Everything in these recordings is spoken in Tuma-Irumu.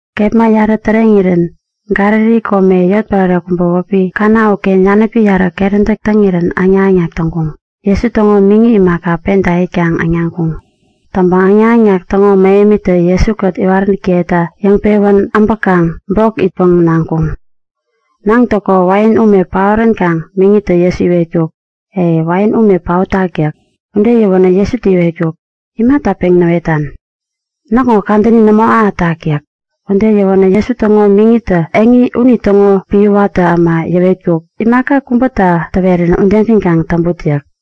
Kepma yarä täreŋirän Galili kome, yotpärare kubä wäpi Kana uken yanäpi yarä keräntäk täŋirän äŋnak-äŋnak täŋkuŋ. Jesu täŋo miŋi imaka, penta itkaŋ äŋnaŋkuŋ. Täŋpäŋ äŋnak-äŋnak täŋo mähemitä Jesu-kät iwaräntäkiyeta yäŋpewän äbäkaŋ bok itpäŋ naŋkuŋ. Näŋtäko wain ume paoränkaŋ miŋitä Jesu iwetkuk; E, wain ume paotak yäk. Ude yäwänä Jesutä iwetkuk; Imata peŋ näwetan? Näkŋo kadäni nämo ahätak yäk. Ude yäwänä Jesu täŋo miŋitä eŋi unitäŋo epän watä äma yäwetkuk; Imaka kubäta täwerirän udegän kaŋ täŋput yäk.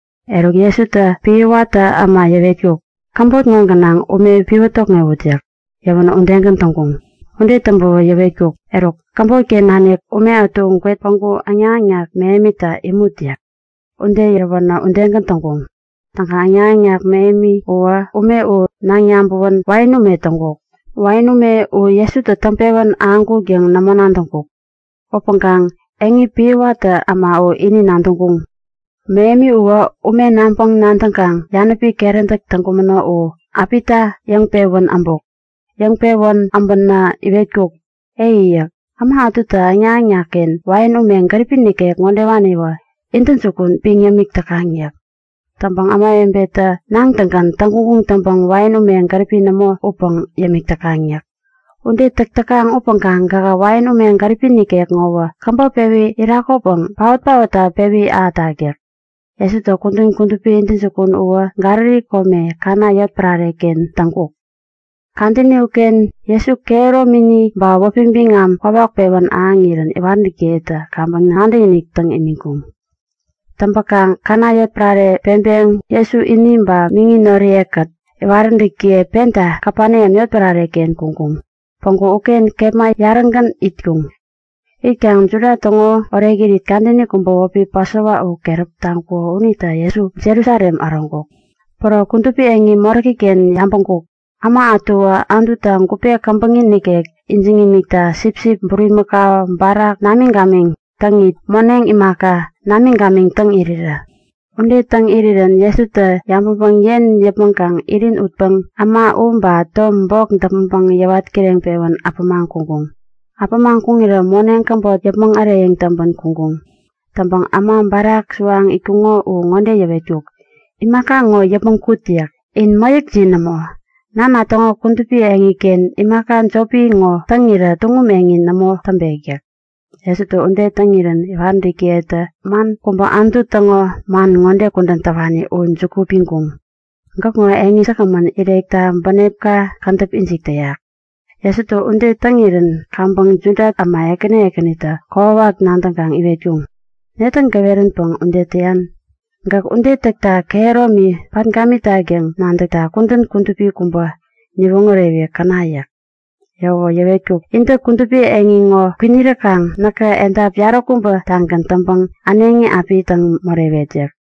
Eruk Jesutä epän watä äma yäwetkuk; Käbot ŋo gänaŋ ume piwä tokŋewut yäk. Yäwänä udegän täŋkuŋ. Ude täŋpäwä yäwetkuk; Eruk, käbot-ken nanik ume ätu gwet päŋku äŋnak-äŋnak mähemita imut yäk. Ude yäwänä udegän täŋkuŋ. Täŋkaŋ äŋnak-äŋnak mähemi uwä ume u naŋ yabäwän wain ume täŋkuk. Wain ume u Jesutä täŋpewän ahäŋkuk yäŋ nämo nadäŋkuk. (Upäŋkaŋ eŋi epän watä äma u ini nadäŋkuŋ.) Mähemi uwä ume naŋpäŋ-nadäŋkaŋ yanäpi keräntäk täŋkumäno u äpita yäŋpewän äbuk. Yäŋpewän äbänä iwetkuk; E! yäk. Äma ätutä äŋnak-äŋnakken wain ume gäripi nikek ŋodewaniwä intäjukun piŋ yämik täkaŋ yäk. Täŋpäŋ ämawebetä näŋtäŋgän täŋguŋ taŋpäŋ wain ume gäripi nämo upäŋ yämik täkaŋ yäk. Ude täk täkaŋ upäŋkaŋ gähä wain ume gäripi nikek ŋowä käbop pewi irakopäŋ paot-paotta pewi ahätak yäk. Jesu kudän kudupi intäjukun uwä Galili kome Kana yotpärare-ken täŋkuk. Kadäni uken Jesu kehäromini ba wäpi biŋam kwawak pewän ahäŋirän iwaräntäkiyetä kaŋpäŋ nadäkinik täŋ imiŋkuŋ. Täŋpäkaŋ Kana yotpärare peŋpeŋ Jesu ini ba miŋi noriye-kät, iwaräntäkiye penta Kapeneam yotpärareken kuŋkuŋ. Päŋku uken kepma yarägän itkuŋ. Itkaŋ Juda täŋo orekirit kadäni kubä wäpi Pasova u keräp taŋkuko unita Jesu Jerusalem äroŋkuk. Päro kudupi eŋi moräki-ken yabäŋkuk; Äma ätuwä Anututa gupe käbäŋi nikek ijiŋ imikta sipsip, bulimakau, barak namiŋ-gamiŋ täŋit moneŋ imaka, namiŋ-gamiŋ täŋ irirä. Ude täŋ irirä Jesutä yabäŋpäŋ yen yäpmäŋkaŋ irin utpäŋ äma u ba tom bok däpmäŋpäŋ yäwat kireŋpewän äpämaŋ kuŋkuŋ. Äpämaŋ kuŋirä moneŋ käbot yäpmäŋ äreyäŋ täŋpän kuŋkuŋ. Täŋpäŋ äma barak suwaŋ itkuŋo u ŋode yäwetkuk; Imaka ŋo yäpmäŋ kut! yäk. In mäyäkjin nämo! Nana täŋo kudupi eŋiken imaka jopi ŋo täŋirä tuŋum eŋi nämo täŋpek yäk. Jesutä ude täŋirän iwaräntäkiyetä man kubä Anutu täŋo man ŋode kudän täwani u juku piŋkuŋ; Gäkŋo eŋi säkgämän irekta bänepna kädäp ijik täyak. Jesutä ude täŋirän kaŋpäŋ Juda äma ekäni ekänitä kokwawak nadäŋkaŋ iwetkuŋ; Netä gäweränpäŋ ude täyan? Gäk ude täkta kehäromi pat gamitak yäŋ nadäkta kudän kudupi kubä niwoŋärewi käna! yäk. Yäwäwä yäwetkuk; Intä kudupi eŋi ŋo kwiniräkaŋ näkä edap yaräkubä-tagän täŋpäŋ äneŋi api täŋ morewet yäk.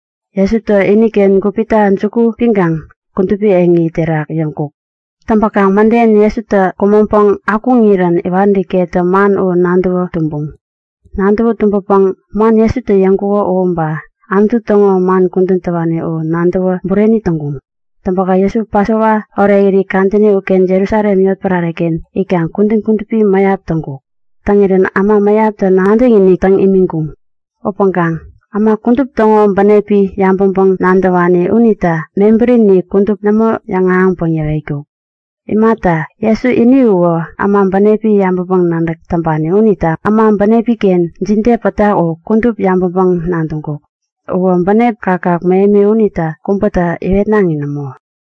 Jesutä iniken gupita juku piŋkaŋ kudupi eŋi terak yäŋkuk. Täŋpäkaŋ mäden, Jesutä kumäŋpäŋ akuŋirän iwaräntäkiyetä man u nadäwä tumbuŋ. Nadäwä tumbäpäŋ man Jesutä yäŋkuko u ba Anutu täŋo man kudän täwani u nadäwä bureni täŋkuŋ. Täŋpäkaŋ Jesu Pasova orekirit kadäni uken Jerusalem yotpärare-ken itkaŋ kudän kudupi mäyap täŋkuk. Täŋirän äma mäyaptä nadäkinik täŋ imiŋkuŋ. Upäŋkaŋ äma kudup täŋo bänepi yabäŋpäŋ-nadäwani unita mebärini kudup nämo yäŋahäŋpäŋ yäwetkuk. Imata, Jesu ini uwä äma bänepi yabäŋpäŋ-nadäk täŋpani unita äma bänepi-ken jide pätak u kudup yabäŋpäŋ-nadäŋkuk. Uwä bänep kakkak mähemi unita kubätä iwetnaŋi nämo.